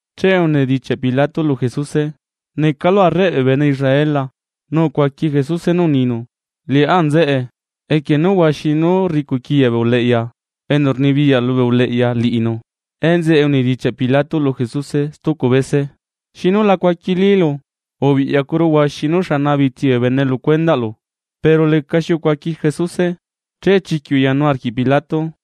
Che unidichiaꞌ Pilato lu Jesuse: ―¿Necalu Arreꞌ bee bene Israel la? Nu ucuaqui Jesuse nú uninu: ―Liꞌá nzeꞌe. Equie nú huaxi nú rricuꞌquiya bee uleꞌya enu rnibiyaꞌ lubee uleꞌya liꞌinu. Enzeꞌe unidichiaꞌ Pilato lu Jesuse stucu bese: ―¿Xinu la cuaquilílu? Ubiꞌyacuru huaxi nú rni bee bene lu cuendaꞌlu. Pero lecaxi ucuaqui Jesuse, che chiquiꞌ uyanu arquiꞌ Pilato.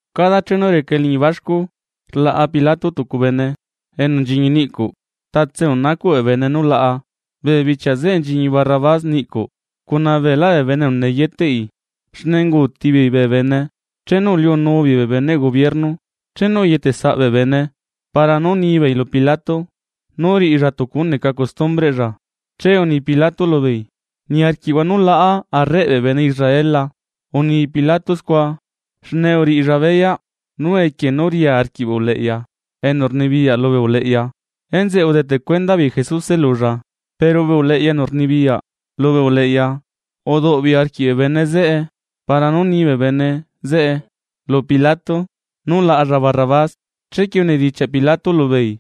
Cada chenu reca eliñi baxcu, rlaꞌa Pilato tucu bene enu nchiñi niꞌcuꞌ, tatse enu nacuꞌ bee bene nú laꞌa. Bee bichia zeꞌe nchiñi Barrabás niꞌcuꞌ cuna beelá bee bene enu neyeteꞌi, xne unguuti beei bee bene chenu uliunu beei bee beneꞌ gobierno. Chenu uyetesaꞌ bee bene para nú nibeei lu Pilato nú riꞌilla tucu nú neca costumbreꞌlla, che uni Pilato lubeei: ―¿Niarquiꞌhua nú laꞌa Arreꞌ bee bene Israel la? Uni Pilato scua xne uriꞌilla beyaꞌ nú equie nú ria arquiꞌ bee uleꞌya enu rnibiyaꞌ lubee uleꞌya, enzeꞌe udeteꞌ cuenda beei Jesuse lulla. Pero bee uleꞌya enu rnibiyaꞌ lubee uleꞌya uduꞌbeei arquiꞌ bee bene zeꞌe para nú ni bee bene zeꞌe lu Pilato nú laꞌalla Barrabás. Chequie unidichiaꞌ Pilato lubeei: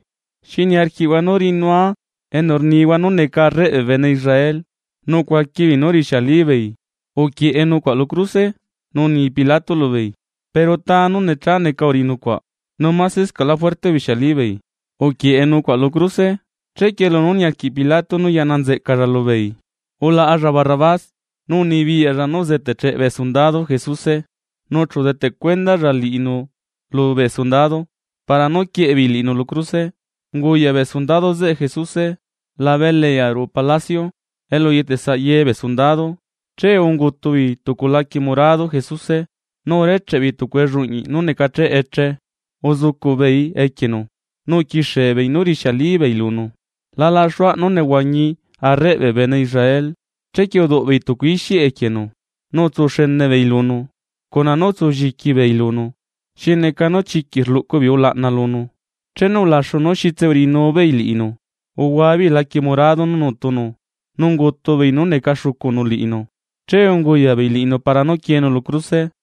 ―¿Xi niarquiꞌhua nú riꞌinua enu rnihua nú neca arreꞌ bee bene Israel? Nu ucuaqui beei nú urixialibeei: ―¡Uquieꞌe nucuaꞌa lu cruse! Nu uni Pilato lubeei: ―Pero ¿ta nú necha neca uriꞌi nucuaꞌ? Nu masescaꞌlá juerte ubixialí beei: ―¡Uquieꞌe nucuaꞌ lu cruse! Chequie lunú niarquiꞌ Pilato nú yaꞌna nzeꞌcalla lubeei, ulaꞌalla Barrabás. Nu unibiyaꞌlla nú uzeteꞌcheꞌ bee sundado Jesuse, nu chu udeteꞌ cuendalla liꞌinu lubee sundado para nú quieꞌe beei liꞌinu lu cruse. Unguyaꞌ bee sundado zeꞌe Jesuse labe eliꞌyaꞌ ruꞌu palacio, elu uyetesaꞌ ye bee sundado. Che ungutu beei tucu laquie morado Jesuse, nu urecheꞌe beei tucu elluꞌñiꞌ nú necacheꞌe eche uzucuꞌ beei equienu. Nu uquixie beei nú rixiali beei lunu: ―¡La laxuaꞌ nú nehuañi Arreꞌ bee bene Israel! Chequie uduꞌbeei tucu ixiꞌ equienu, nu utsu xene beei lunu, cuna nú utsu lliqui beei lunu, xi neca nú chiquiꞌ rluꞌcu beei ulaꞌna lunu. Chenu ulaxu nú xitse uriꞌinu beei liꞌinu, uhuabeei laquie morado nú nutunu nu ungutu beei nú neca xucunu liꞌinu, che unguyaꞌ beei liꞌinu para nú quieenu lu cruse.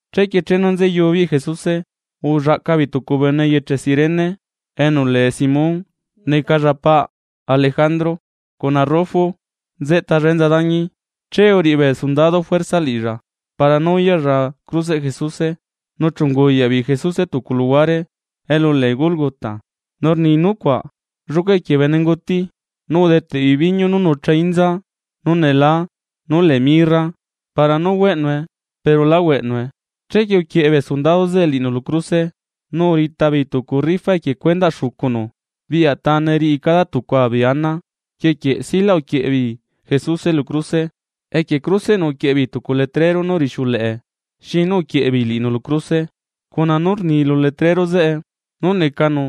Chequie chenu nzeyu beei Jesuse, ullaꞌca beei tucu bene eyeche Cirene enu lee Simón necalla paꞌ Alejandro cuna Rufo nzeꞌtalla enza dañi. Che uriꞌi bee sundado juerza liꞌilla para nú uyaꞌlla cruseꞌ Jesuse. Nu chu unguyaꞌ beei Jesuse tucu luhuare elu lee Gólgota, nu rni nucuaꞌ: lluca equie bene nguti. Nu udeteꞌ beei biñu nú nucha inza nú nelaa nú lee mirra, para nú hueꞌnue pero lá hueꞌnue. Chequie uquieꞌe bee sundado zeꞌe liꞌinu lu cruse. Nu urita beei tucu rifa equie cuendaꞌ xucunu biꞌya tane riꞌi cada tucua beei ana. Rquie quieꞌ silaꞌ uquieꞌe beei Jesuse lu cruse. Equie cruseꞌnu uquieꞌe beei tucu letrero nú rixiuleꞌe xi nú uquieꞌe beei liꞌinu lu cruse, cuna nú rni lu letrero zeꞌe nú necanu: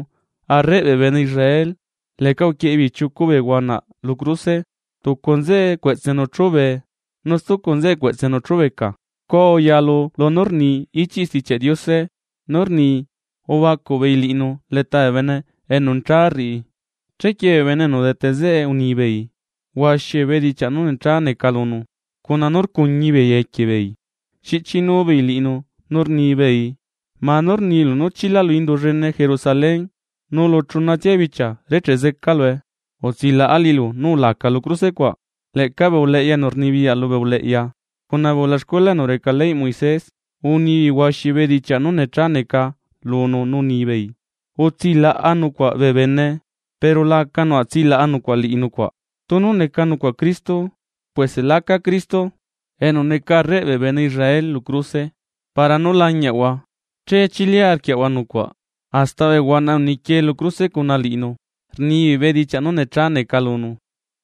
“Arreꞌ bee bene Israel.” Leꞌca uquieꞌe beei chiucu huanaꞌ lu tucua cruse, tucu nzeꞌe cueꞌtsenu chúbee nu stucu nzeꞌe cueꞌtsenu chubeca. Scua uyalu lunú rni lu ichiꞌ Stichiaꞌ Diose nú rni: “Ubacuꞌ beei liꞌinu leta bee bene enu necha rriꞌi.” Chequie bee bene enu udete zeꞌe unibeei huaxi bedichiaꞌ nú necha neca lunu, cuna nú rcuñi beei equie beei xiꞌchinu beei liꞌinu nú rnibeei: ―¡Manú! Rnilu nú chilalu indu llene Jerusalén nu lu chunatsia bichia recheꞌ zecalue, utsilaꞌa liꞌilu nu ulaca lu cruse cuaꞌ. Leꞌca bee uleꞌya enu rnibiyaꞌ lubee uleꞌya cuna bee ulaxcuela enu reca ley Moisés, unibeei huaxi bedichiaꞌ nú necha neca lunu nu unibeei: ―Utsilaꞌa nucuaꞌ bee bene, pero la aca nucuaꞌ tsilaꞌa nucuaꞌ liꞌi nucuaꞌ. ¡Tunu neca nucuaꞌ Cristo puese láca Cristo enu neca arreꞌ bee bene Israel lu cruse para nú lañiaꞌahua, che chili arquiaꞌahua nucuaꞌ! Hasta bee huanaꞌ enu nequie lu cruse cuna liꞌinu rnibeei bedichiaꞌ nú necha neca lunu.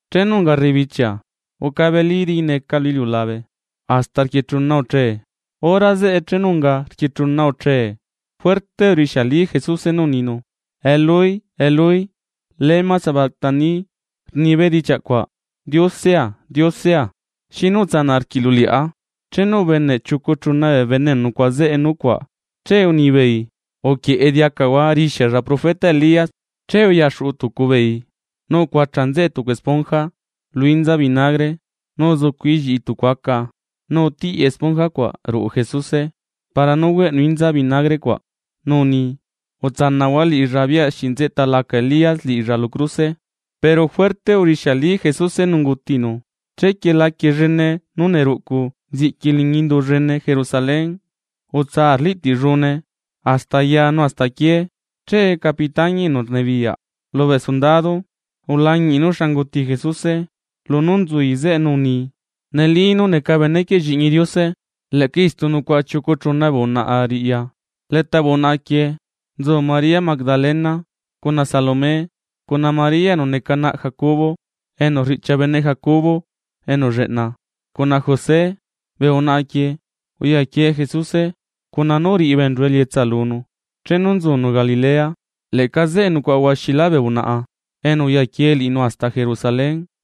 Chenu unga rrebichia ucabeli diqui neca lu iliulabe hasta rquie chuna uche. Hora zeꞌe chenu unga rquie chuna uche juerte urixiali Jesuse nú uninu: ―Eloi, Eloi, ¿lama sabactani? ―rni bedichiaꞌcuaꞌ: Diosea, Diosea, ¿xinu utsanaꞌ arquiꞌlu liꞌá? Chenu ubeneꞌ chiucu chuna bee bene enu nucuaꞌa zeꞌe nucuaꞌ, che unibeei: ―Uquieꞌe diacahua rixialla profeta Elías. Che uyaxuꞌu tucu beei nu ucuacha nzeꞌe tucu esponja lu inza vinagre nu uzucuꞌi lliꞌi tucu aca nu utiꞌi esponja cuaꞌ ruꞌu Jesuse para nú hueꞌnu inza vinagre cuaꞌ nu uni: ―Utsanaꞌhua liꞌilla biꞌya se nzeꞌta laca Elías liꞌilla lu cruse. Pero juerte urixiali Jesuse nu ungutinu. Chequie laquie llene nú neruꞌcu nziꞌqui liñi indu llene Jerusalén, utsa arliꞌtiꞌllune hasta aya nu hasta aquié. Che capitañi enu rnibiyaꞌ lubee sundado ulañiꞌi nú xa unguti Jesuse lunú nzui zeꞌe nu uni: ―Neli nú neca benequieꞌ Lliꞌñi Diose. Leꞌca istu nucuaꞌa chiucu chuna bee unaꞌa riꞌya, leta bee unaꞌa quieꞌ nzu María Magdalena, cuna Salomé cuna María enu neca naꞌ Jacobo enu riꞌchia bene Jacobo enu lleꞌna, cuna José. Bee unaꞌa quieꞌ uyaquie Jesuse cuna nú uriꞌi beenchu elietsa lunu chenu nzunu Galilea. Leꞌca zeꞌe nucuaꞌa huaxilá bee unaꞌa enu uyaquie liꞌinu hasta Jerusalén.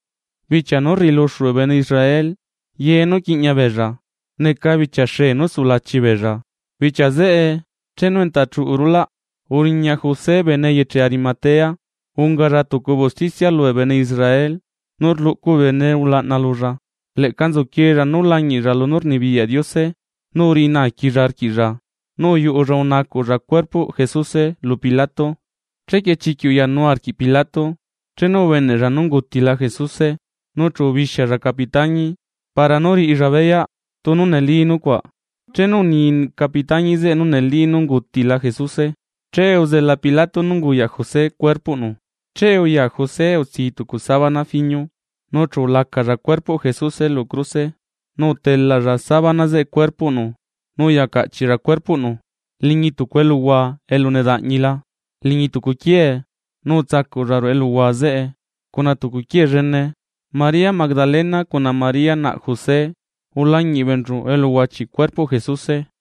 Bichia nú rriꞌiluxu bee bene Israel ye nú quiꞌña beella neca bichia xee nu sulachi beella. Bichia zeꞌe chenu enta chuꞌu rulaꞌ, uriña José bene eyeche Arimatea. Ungalla tucu bee usticia lubee bene Israel, nu rluꞌcu bee bene ulaꞌna lulla. Leꞌca nzuquiella nú lañiꞌlla lunú rnibiyaꞌ Diose, nu uyuꞌu valuruꞌlla unacuꞌlla cuerpoꞌ Jesuse lu Pilato. Chequie chiquiꞌ uyanu arquiꞌ Pilato chenu ubeneꞌlla nú ungutila Jesuse, nu chu ubixialla capitañi para nú riꞌilla beyaꞌ tunu neli nucuaꞌ. Chenu uni capitañi zeꞌe nú neli nú ungutila Jesuse, che uzela Pilato nú unguyaꞌ José cuerpoꞌnu. Chequie uya José utsii tucu sabana fiño nu chu ulacalla cuerpoꞌ Jesuse lu cruse nu utelalla sabana zeꞌe cuerpoꞌnu nu uya caꞌchiꞌlla cuerpoꞌnu liñi tucu eluhua elu nedaꞌñila liñi tucu quiee nu utsacuꞌlla ruꞌu eluhua zeꞌe cuna tucu quiee llene. María Magdalena cuna María naꞌ José ulañiꞌ beenchu elu uhuachiꞌ cuerpoꞌ Jesuse.